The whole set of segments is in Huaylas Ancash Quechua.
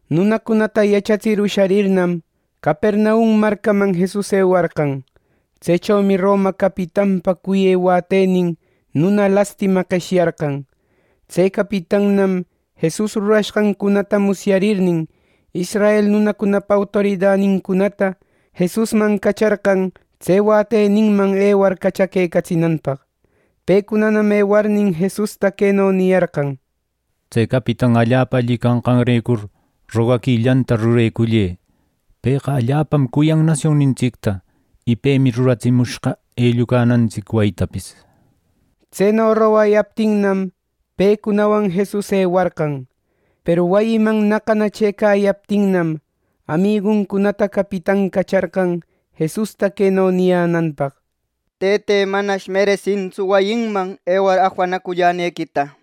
Nunacunata yachatsir usharirnam, Capernaum marcaman Jesus ewarqan. Tsechomi Roma capitanpa cuyë wätenin nuna lastima qeshyarqan. Tse capitannam Jesus rurashqancunata musyarirnin, israel nunacunapa autoridanincunata Jesusman cacharqan tse wäteninman ewar cachaquecatsinanpaq. Pecunanam ewarnin, Jesusta queno niyarqan: —Tse capitan allapa alli canqanrecur, rogaquillanta rurecullë —nir. Pëqa allapam cuyan nasionnintsicta, y pemi ruratsimushqa ellucanantsic wayitapis. Tseno rogayaptinnam, pecunawan Jesus ewarqan. Peru wayiman naqana chëcayaptinnam, amiguncunata capitan cacharqan Jesusta queno niyänanpaq: —Tëte, manash meresintsu wayinman ewar afanacullanequita.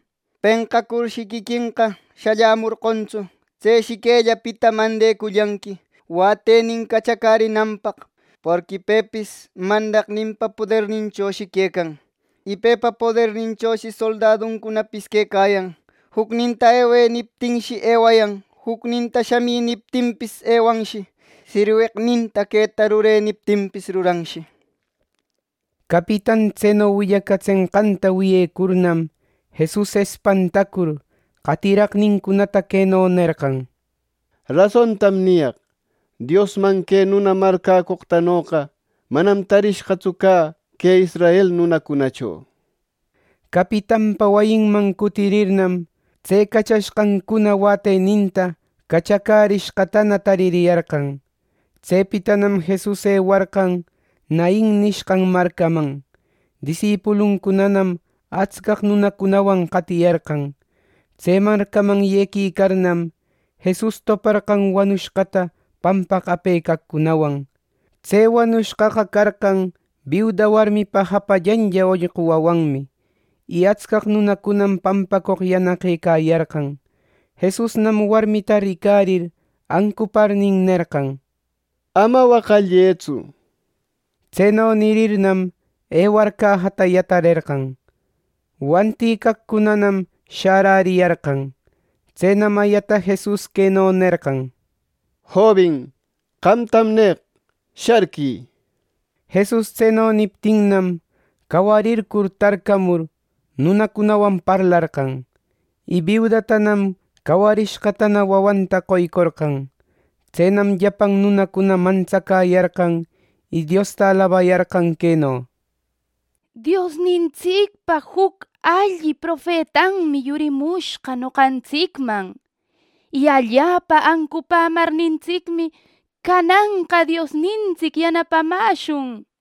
Penqacurshi quiquenqa shallämorqontsu. Tseshi quellapita mandecullanqui wätenin cachacärinanpaq. Porqui pepis mandaqninpa poderninchoshi quecan. Y pepa poderninchoshi soldaduncunapis quecayan. Jucninta ‘Ewë’ niptinshi, ewayan; jucninta ‘Shamï’ niptinpis, ewanshi; sirweqninta ‘Queta rurë’ niptinpis, ruranshi —nir. Capitan tseno willacatsenqanta wiyecurnam, Jesus espantacur, qatiraqnincunata queno nerqan: —Rasontam niyaq: Diosman que nuna marcäcoqtanoqa manam tarishqatsu cä que israel nunacunacho. Capitanpa wayinman cutirirnam, tse cachashqancuna wäteninta cachacärishqatana taririyarqan. Tsepitanam Jesus ewarqan Nain nishqan marcaman. Disipuluncunanam atscaq nunacunawan qatiyarqan. Tse marcaman yequicarnam, Jesus toparqan wanushqata pampaq apecaqcunawan. Tse wanushqaqa carqan biuda warmipa japallanlla ollqu wawanmi, y atscaq nunacunam pampacoq yanaqëcayarqan. Jesusnam warmita ricarir ancuparnin, nerqan: —Ama waqallëtsu. Tseno nirirnam, ewar cajata yatarerqan, wantïcaqcunanam shäräriyarqan. Tsenam ayata Jesus queno nerqan: —Jobin, qamtam neq: Sharquï. Jesus tseno niptinnam, cawarircur tarcamur, nunacunawan parlarqan, y biudatanam cawarishqatana wawanta qoycorqan. Tsenam llapan nunacuna mantsacäyarqan, y Diosta alabayarqan queno: —Diosnintsicpa juc alli profetanmi yurimushqa noqantsicman, y allapa ancupämarnintsicmi, cananqa Diosnintsic yanapamäshun.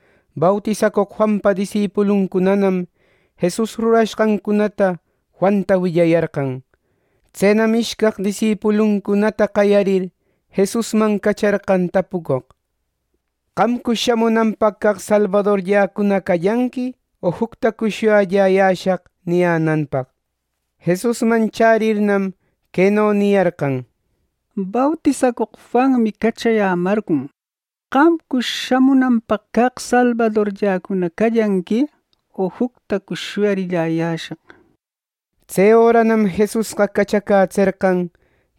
Bautisacoq Juanpa disipuluncunanam Jesus rurashqancunata Juanta willayarqan. Tsenam ishcaq disipuluncunata qayarir, Jesusman cacharqan tapucoq, “¿Qamcush shamunanpaq caq salbadorlläcuna callanqui, o juctacush shuyalläyäshaq?” niyänanpaq. Jesusman chärirnam, queno niyarqan: —Bautisacoq Juanmi cachayämarqon. ¿Qamcush shamunanpaq caq salbadorlläcuna callanqui, o juctacush shuyalläyäshaq? Tse öranam Jesusqa cachacätserqan,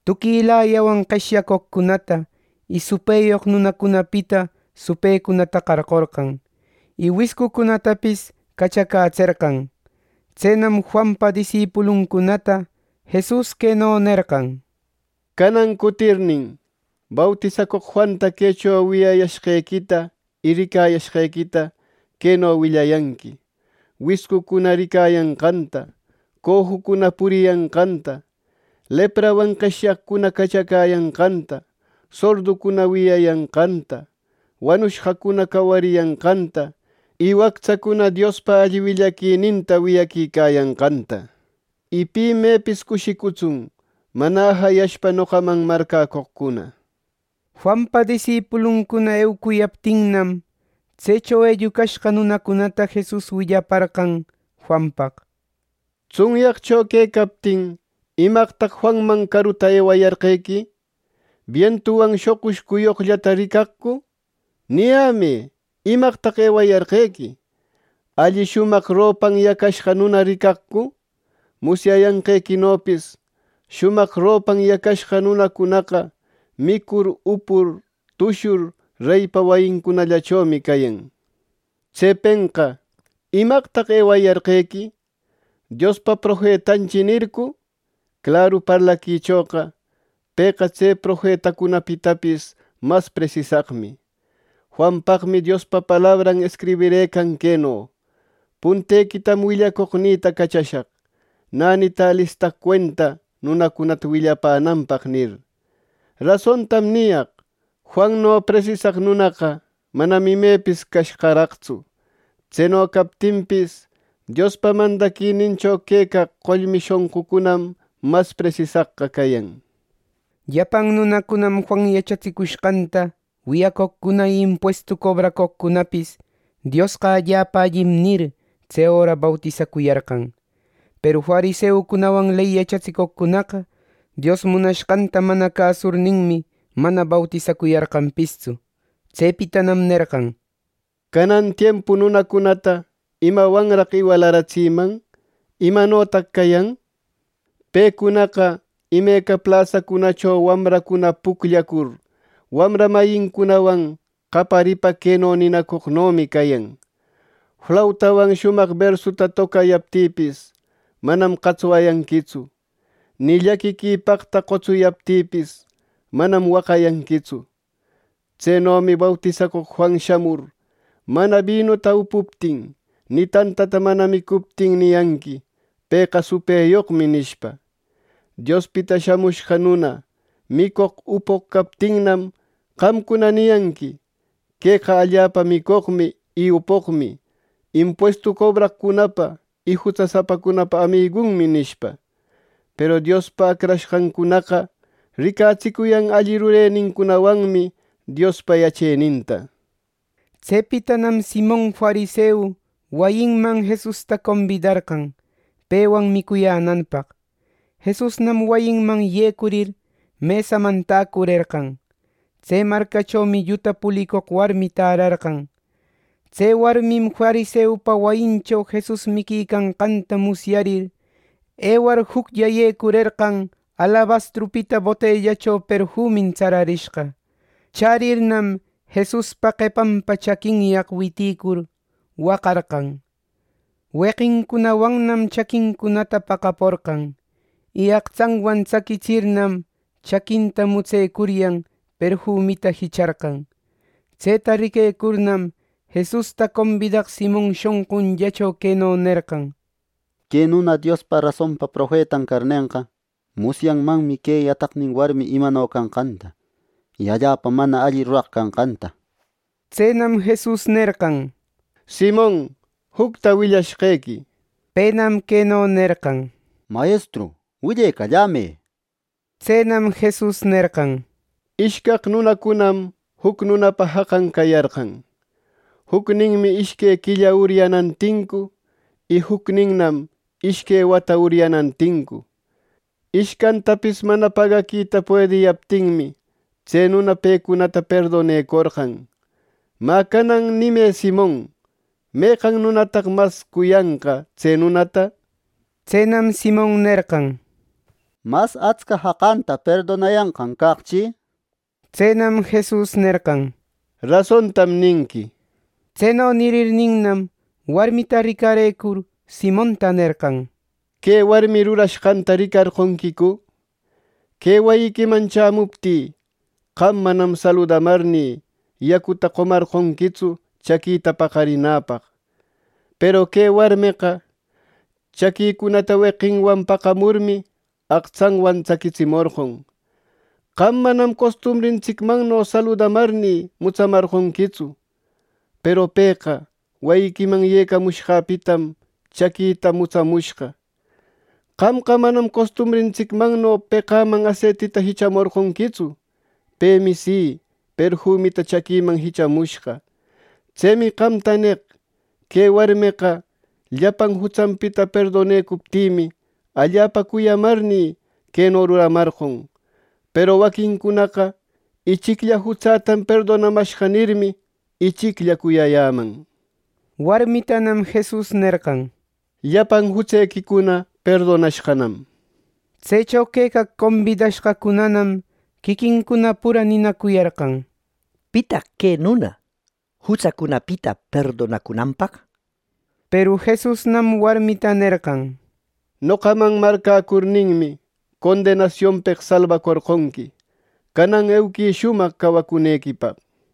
tuquilayawan qeshyacoqcunata, y supëyoq nunacunapita supëcunata qarqorqan; y wiscucunatapis cachacätserqan. Tsenam Juanpa disipuluncunata Jesus queno nerqan: —Canan cutirnin, bautisacoq Juanta quecho wiyayashqequita y ricayashqequita queno willayanqui: wiscucuna ricayanqanta, cojucuna puriyanqanta, leprawan qeshyaqcuna cachacäyanqanta, sorducuna wiyayanqanta, wanushqacuna cawariyanqanta y wactsacuna Diospa alli willaquininta wiyaquicayanqanta, nishpa. Y pi mepis cushicutsun mana ajayashpa noqaman marcäcoqcuna. Juanpa disipuluncuna eucuyaptinnam, tsecho ellucashqa nunacunata Jesus willaparqan Juanpaq: —Tsunyaqcho quecaptin, ¿Imaqtaq Juanman caruta ewayarqequi! ¿Bientuwan shoqush cuyoqllata ricaqcu! ¡Niyämë! ¿Imaqtaq ewayarqequi, alli shumaq ropan yacashqa nuna ricaqcu! Musyayanqequinopis shumaq ropan yacashqa nunacunaqa micur, upur, tushur reypa wayincunallachomi cayan. Tsepenqa, ¿Imaqtaq ewayarqequi! ¿‘Diospa profetanchi’ nircu? ¡Claru parlaquichoqa! Pëqa tse profetacunapitapis mas presisaqmi. Juanpaqmi Diospa palabran escribirëcan queno: ‘Puntequitam willacoqnïta cachashaq, nänita alistaq cuenta nunacunata willapänanpaq’ nir. Rasontam niyaq: Juanno presisaq nunaqa manam imepis cashqaraqtsu. Tseno captinpis, Diospa mandaquinincho quecaq qollmi shonqucunam mas presisaqqa cayan. Llapan nunacunam Juan yachatsicushqanta wiyacoqcuna y impuestu cobraqcunapis, “¡Diosqa allapa allim!” nir, tse öra bautisacuyarqan. Peru fariseucunawan ley yachatsicoqcunaqa Dios munashqanta mana cäsurninmi, mana bautisacuyarqanpistsu. Tsepitanam nerqan: “¿Canan tiempu nunacunata imawanraq iwalaratsiman? ¿Imanotaq cayan? Pecunaqa imeca plasacunacho wamracuna pucllacur, wamra mayincunawan qayaripa queno ninacoqnomi cayan: ‘Flautawan shumaq bersuta tocayaptïpis, manam qatswayanquitsu; ni llaquiquipaqta qotsuyaptïpis, manam waqayanquitsu.’ Tsenomi bautisacoq Juan shamur, mana binuta upuptin, y tantata mana micuptin, niyanqui ‘Pëqa supëyoqmi’ nishpa. Diospita Shamushqa Nuna micoq upoq captinnam, qamcuna niyanqui: ‘Queqa allapa micoqmi y upoqmi, impuestu cobraqcunapa y jutsasapacunapa amigunmi’ nishpa. Peru Diospa acrashqancunaqa ricatsicuyan alli rurenincunawanmi Diospa yacheninta.” Tsepitanam Simon fariseu wayinman Jesusta combidarqan pewan micuyänanpaq. Jesusnam wayiman yecurir, mesaman täcurerqan. Tse marcachomi lluta pulicoq warmi tärarqan. Tse warmim fariseupa wayincho Jesus miquicanqanta musyarir, ewar juclla yecurerqan alabastrupita botellacho perfumin tsararishqa. Chärirnam, Jesuspa qepanpa chaquinyaq witïcur, waqarqan. Weqincunawannam chaquincunata paqaporqan, y aqtsanwan tsaquitsirnam, chaquinta mutsecuryan, perfumita jicharqan. Tseta riquecurnam, Jesusta combidaq Simon shonqunllacho queno nerqan: “Que nuna Diospa rasonpa profetan carnenqa, musyanmanmi que yataqnin warmi imano canqanta, y allapa mana alli ruraq canqanta.” Tsenam Jesus nerqan: —Simon, jucta willashqequi —nir. Penam queno nerqan: —Mayestru, willecallämë —nir. Tsenam Jesus nerqan: —Ishcaq nunacunam juc nunapa jaqan cayarqan. Jucninmi ishque quilla uryanan tincu, y jucninman ishque wata uryanan tincu. Ishcantapis mana pagaquita puediyaptinmi, tse nuna pecunata perdonecorqan. Mä, canan nimë, Simon, ¿meqan nunataq mas cuyanqa tse nunata? Tsenam Simon nerqan: —Mas atsca jaqanta perdonayanqan caqchi —nir. Tsenam Jesus nerqan: —Rasontam ninqui. Tseno nirninnam, warmita ricarëcur, Simonta nerqan: —¿Que warmi rurashqanta ricarqonquicu? Que wayiquiman chämuptï, qam manam saludamarnï, yacuta qomarqonquitsu chaquïta paqarinäpaq; peru que warmeqa chaquïcunata weqinwan paqamurmi, aqtsanwan tsaquitsimorqon. Qam manam costumbrintsicmanno saludamarnï, mutsamarqonquitsu; peru pëqa wayiquiman yecamushqäpitam chaquïta mutsamushqa. Qamqa manam costumbrintsicmanno peqäman aseitita jichamorqonquitsu; pemi si, perfumita chaquïman jichamushqa. Tsemi qamta neq: Que warmeqa llapan jutsanpita perdonecuptïmi, allapa cuyamarnï, queno ruramarqon; peru waquincunaqa ‘ichiclla jutsätam perdonamashqa’ nirmi, ichiclla cuyayäman. Warmitanam Jesus nerqan: —Llapan jutsequicuna perdonashqanam. Tsecho quecaq combidashqacunanam quiquincuna pura ninacuyarqan: —¿Pitaq que nuna, jutsacunapita perdonacunanpaq? Peru Jesusnam warmita nerqan: —Noqaman marcäcurninmi, condenasionpeq salbacorqonqui. Canan euquï shumaq cawacunequipaq.